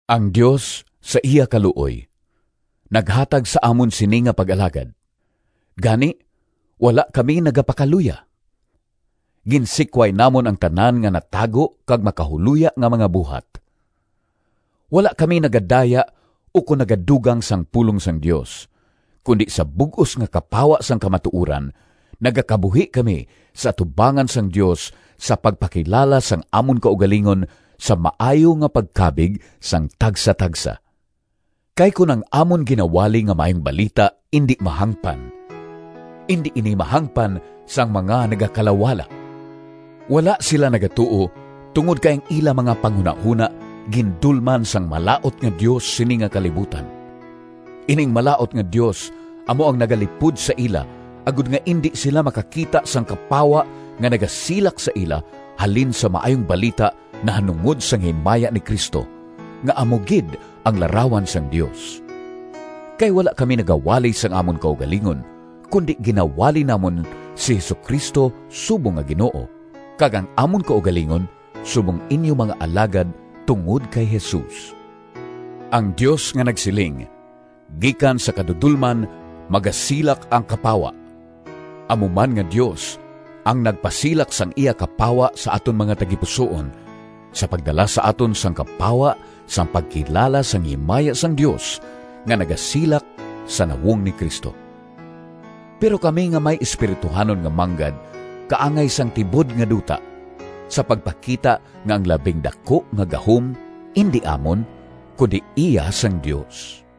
Ang Dios, sa iya kaluoy, naghatag sa amon sini nga pag-alagad, gani, wala kami nagapakaluya. Ginsikway namon ang tanan nga natago kag makahuloya nga mga buhat. Wala kami nagadaya ukon nagadugang sang pulong sang Dios, kundi sa bug-os nga kapawa sang kamatuoran, nagakabuhi kami sa atubangan sang Dios sa pagpakilala sang amon kaugalingon sa maayo nga pagkabig sang tagsatagsa. Kay kon ang amon ginawali nga Maayong Balita indi mahangpan, indi ini mahangpan sang mga nagakalawala. Wala sila nagatuo tungod kay ang ila mga panghunahona gindulman sang malaut nga dios sini nga kalibutan. Ining malaut nga dios amo ang nagalipod sa ila agod nga indi sila makakita sang kapawa nga nagasilak sa ila halin sa Maayong Balita nahanungod sang himaya ni Cristo, nga amo gid ang larawan sang Dios. Kay wala kami nagawali sang amon kaugalingon, kundi ginawali namon si Jesu-Cristo subong nga Ginoo, kag ang amon kaugalingon subong inyo mga alagad tungod kay Jesus. Ang Dios nga nagsiling, “Gikan sa kadudolman magasilak ang kapawa!” amo man nga Dios ang nagpasilak sang iya kapawa sa aton mga tagipusoon, sa pagdala sa aton sang kapawa sang pagkilala sang himaya sang Dios, nga nagasilak sa nawong ni Cristo. Pero kami nga may espirituhanon nga manggad kaangay sang tibod nga duta, sa pagpakita nga ang labing daku nga gahom indi amon, kundi iya sang Dios.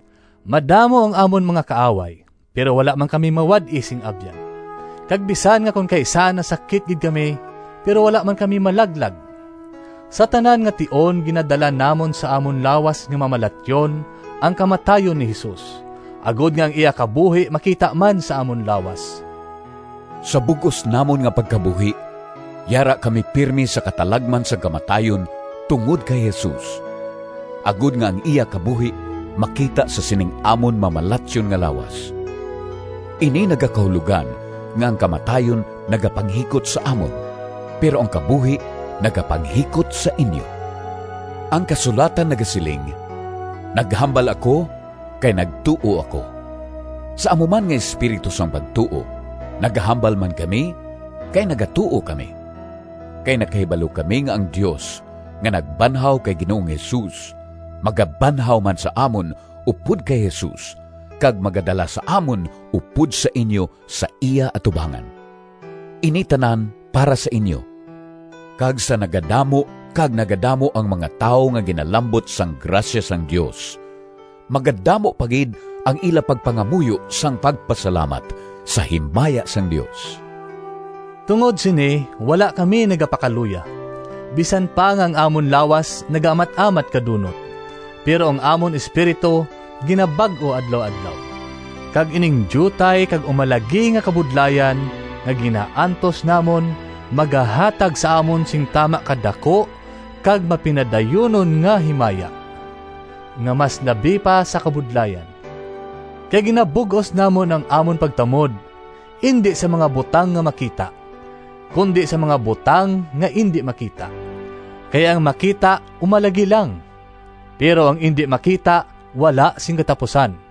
Madamo ang amon mga kaaway, pero wala man kami mawad-i sing abyan. Kag bisan nga kon kaisa nasakit gid kami, pero wala man kami malaglag. Sa tanan nga tion ginadala namon sa amon lawas nga mamalatyon ang kamatayon ni Jesus, agod nga ang iya kabuhi makita man sa amon lawas. Sa bug-os namon nga pagkabuhi yara kami pirme sa katalagman sang kamatayon tungod kay Jesus, agod nga ang iya kabuhi makita sa sining amon mamalatyon nga lawas. Ini nagakahulogan nga ang kamatayon nagapanghikot sa amon, pero ang kabuhi nagapanghikot sa inyo. Ang kasulatan nagasiling, “Naghambal ako kay nagtuo ako.” Sa amo man nga espiritu sang pagtuo, nagahambal man kami kay nagatuo kami. Kay nakahibalo kami nga ang Dios, nga nagbanhaw kay Ginoong Jesus, magabanhaw man sa amon upod kay Jesus kag magadala sa amon upod sa inyo sa iya atubangan. Ini tanan para sa inyo, kag sa nagadamo kag nagadamo ang mga tawo nga ginalambot sang grasya sang Dios, magadamo pa gid ang ila pagpangamuyo sang pagpasalamat, sa himaya sang Dios. Tungod sini wala kami nagapakaluya. Bisan pa nga ang amon lawas nagaamat-amat kadunot, pero ang amon espiritu ginabag-o adlaw-adlaw. Kag ining diutay kag umalagi nga kabudlayan nga ginaantos namon magahatag sa amon sing tama ka daku kag mapinadayunon nga himaya, nga mas labi pa sa kabudlayan. Kay ginabug-os namon ang amon pagtamod, indi sa mga butang nga makita, kundi sa mga butang nga indi makita. Kay ang makita umalagi lang, pero ang indi makita wala sing katapusan.